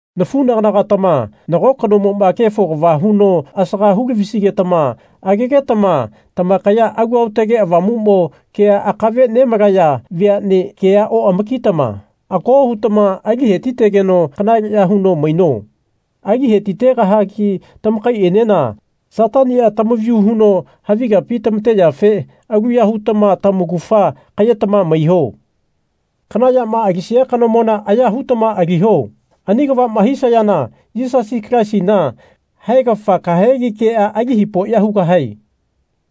Nafunagana-gatama nago kanomoma kefo kava huno asaga hu-lavisigetama agegetama tamakaya Alu Aotage Avamumo kea akave nemalaya veane kea oamakitama ako hutama ali hetigeno kanaleya huno maino. Ali hetitegahagi tamakaienena Satania tamavayu huno havi kapi tamateyafe aluya hutama tamaugafa kayetama maiho. Kana yama alisia kanomona aya hutama aliho. Ani kavama hisayana Yisasi Kalaisina haegafa kahegi kea ali hipoya hugahae.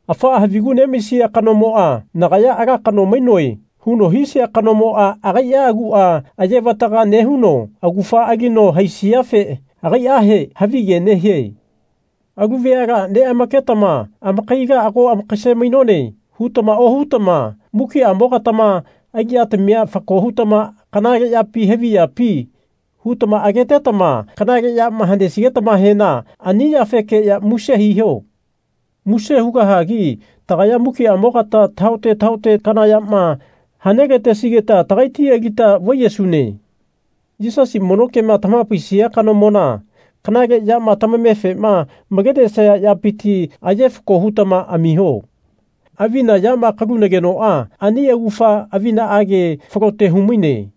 Afaa havigu nemaisia kanomoa Nagaya ala kano mainoe. huno hisia kanomoa agaia agua ayevataga nehuno augafa alino haisiafe agaiahe havige nehie. Alu veala neamaketama Amakaila ago amakase-mainone. hutama ohutama mukiamogatama aliyatamia fako hutama Kanale yapi havi yapi? hutama agetetama kanale yama hanesigetamahena ani yafekeya muse hiho. Muse hugahagi tagaya mukiamogata tahaote tahaote kana yama hane-latesigeta tagaiti alita vaiyesune. Yisasi mono kema tamahapaisia kanomona kanale yama tamamefe malenesaya yapiti aye fako hutama amiho. Avina yama kalunagenoa ani augafa avinaage falote humaine.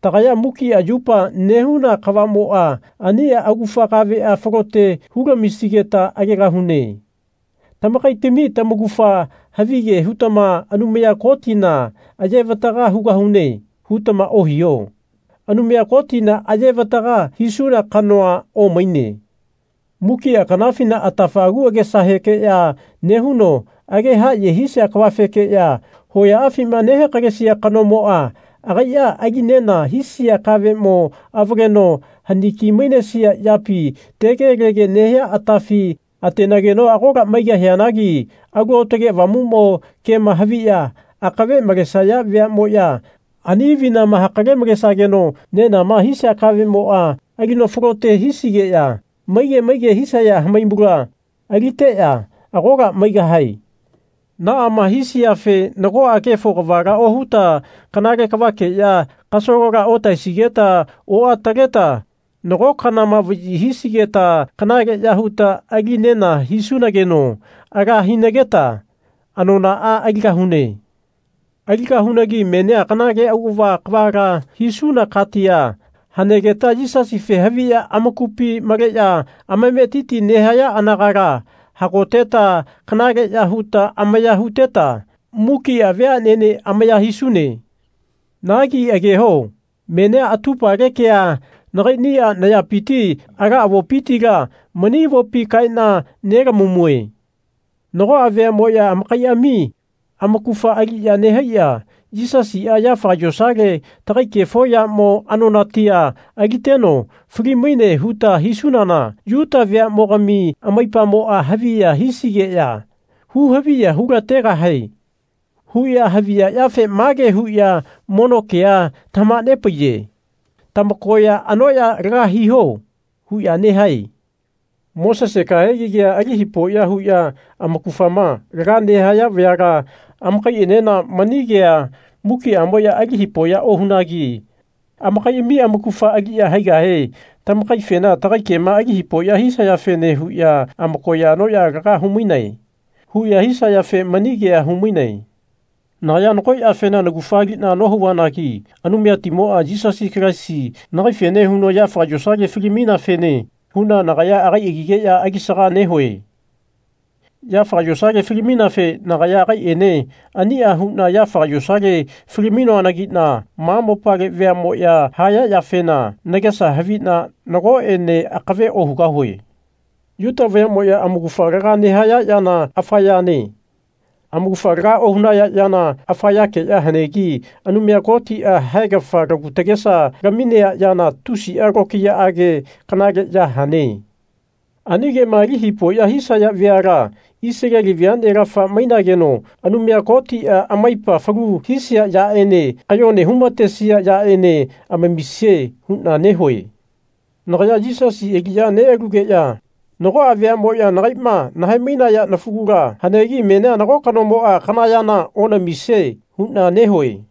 Tagaya mukia yupa nehuna kavamoa ania augafa kavea falote hu lamisigeta agegahune. Tamakaitami tamaugafa havige hutama Anumaya Kotina ayevataga hugahune. hutama ohiho. Anumaya Kotina ayevataga hisuna kanoa omaine. Mukia kanafina atafa agu agesahekeya nehuno age haye hisia kavafekeya hoyaafima nehakalesia kanomoa agaia ali nena hisia kavemo avaleno haniki-mainesia yapi tegelege nehia atafi atenageno agola maigahianagi Alu Aotage Avamumo kema haviya akave malesaya veamoya ani avinama hakale-malesageno nenama hisia kavemoa alino falote hisigeya maige maige hisaya hamaimula aliteya agola maigahae. Naama hisiafe nagoa kefo kavala ohuta kanale kavakeya kasalola otahaesigeta oataleta nago kanama vayi hisigeta kanaleya huta ali nena hisunageno ala hinageta anonaa aligahune. Aligahunagi menia kanale auava kavala hisuna katia hanegeta Yisasife haviya amakupi maleya amametiti nehaya anagala hagoteta kanaleya huta amaya huteta mukia veanene amaya hisune. Nagi ageho. Menia atupale kea nakainia nayapiti ala avopitila mani avopi kaena nelamamue. Nagoa veamoya amakaiami amaugafa aliya nehaiya Yisasia yafaga yosale tagai kefo yamo anonatia aliteno fali-maine huta hisunana Yuta veamogami amaipamoa haviya hisigeya hu-haviya hu-lategahae. huya haviya yafe mage huya mono kea tamahanepaiye Tamakoya anoya laga hiho. huya nehae. Mosese kahegi kea ali hipoya huya amaugafama laga nehaya vayala amakaienena mani kea mukiamoya ali hipoya ohunagi. Amakaiami amaugafa aliya haigahe tamakaifena Tagai kema ali hipoya hisayafene huya amakoya anoya laga humainae. huya hisayafene mani kea humainae. Nagaya nago yafena naugafa alina nohauvanagi Anumayatimoa Yisasi Kalaisi nagaifene huno yafaga yosale fali-maineafene huna nagaya agai agigeya alisaga nehue. Yafaga yosale fali-maineafe nagaya agaiene ania huna yafaga yosale fali-mainoanagina ma mopale veamoya haya yafena nagesa havina nagoene akave ohugahue. Yuta vayamoya amaugafa laga nehaya yana afa yane. Amaugafa laga ohunaya yana afa yakeya hanegi Anumaya Kotia haegafa lagu tagesa laminea yana tusia tokiyaage kanale ya hane. Ani kema ali hipoya hisaya veala Isaleli veanelafa mainageno Anumaya Kotia amaipa falu hisia yaene kayone humatesia yaene amamisie huna nehue. Nagaya Yisasi aliya nealugeya nagoa veamoya nagaima nahae-mainaya nafugula hanegi menia nago kanomoa kana yana onamisie huna nehue.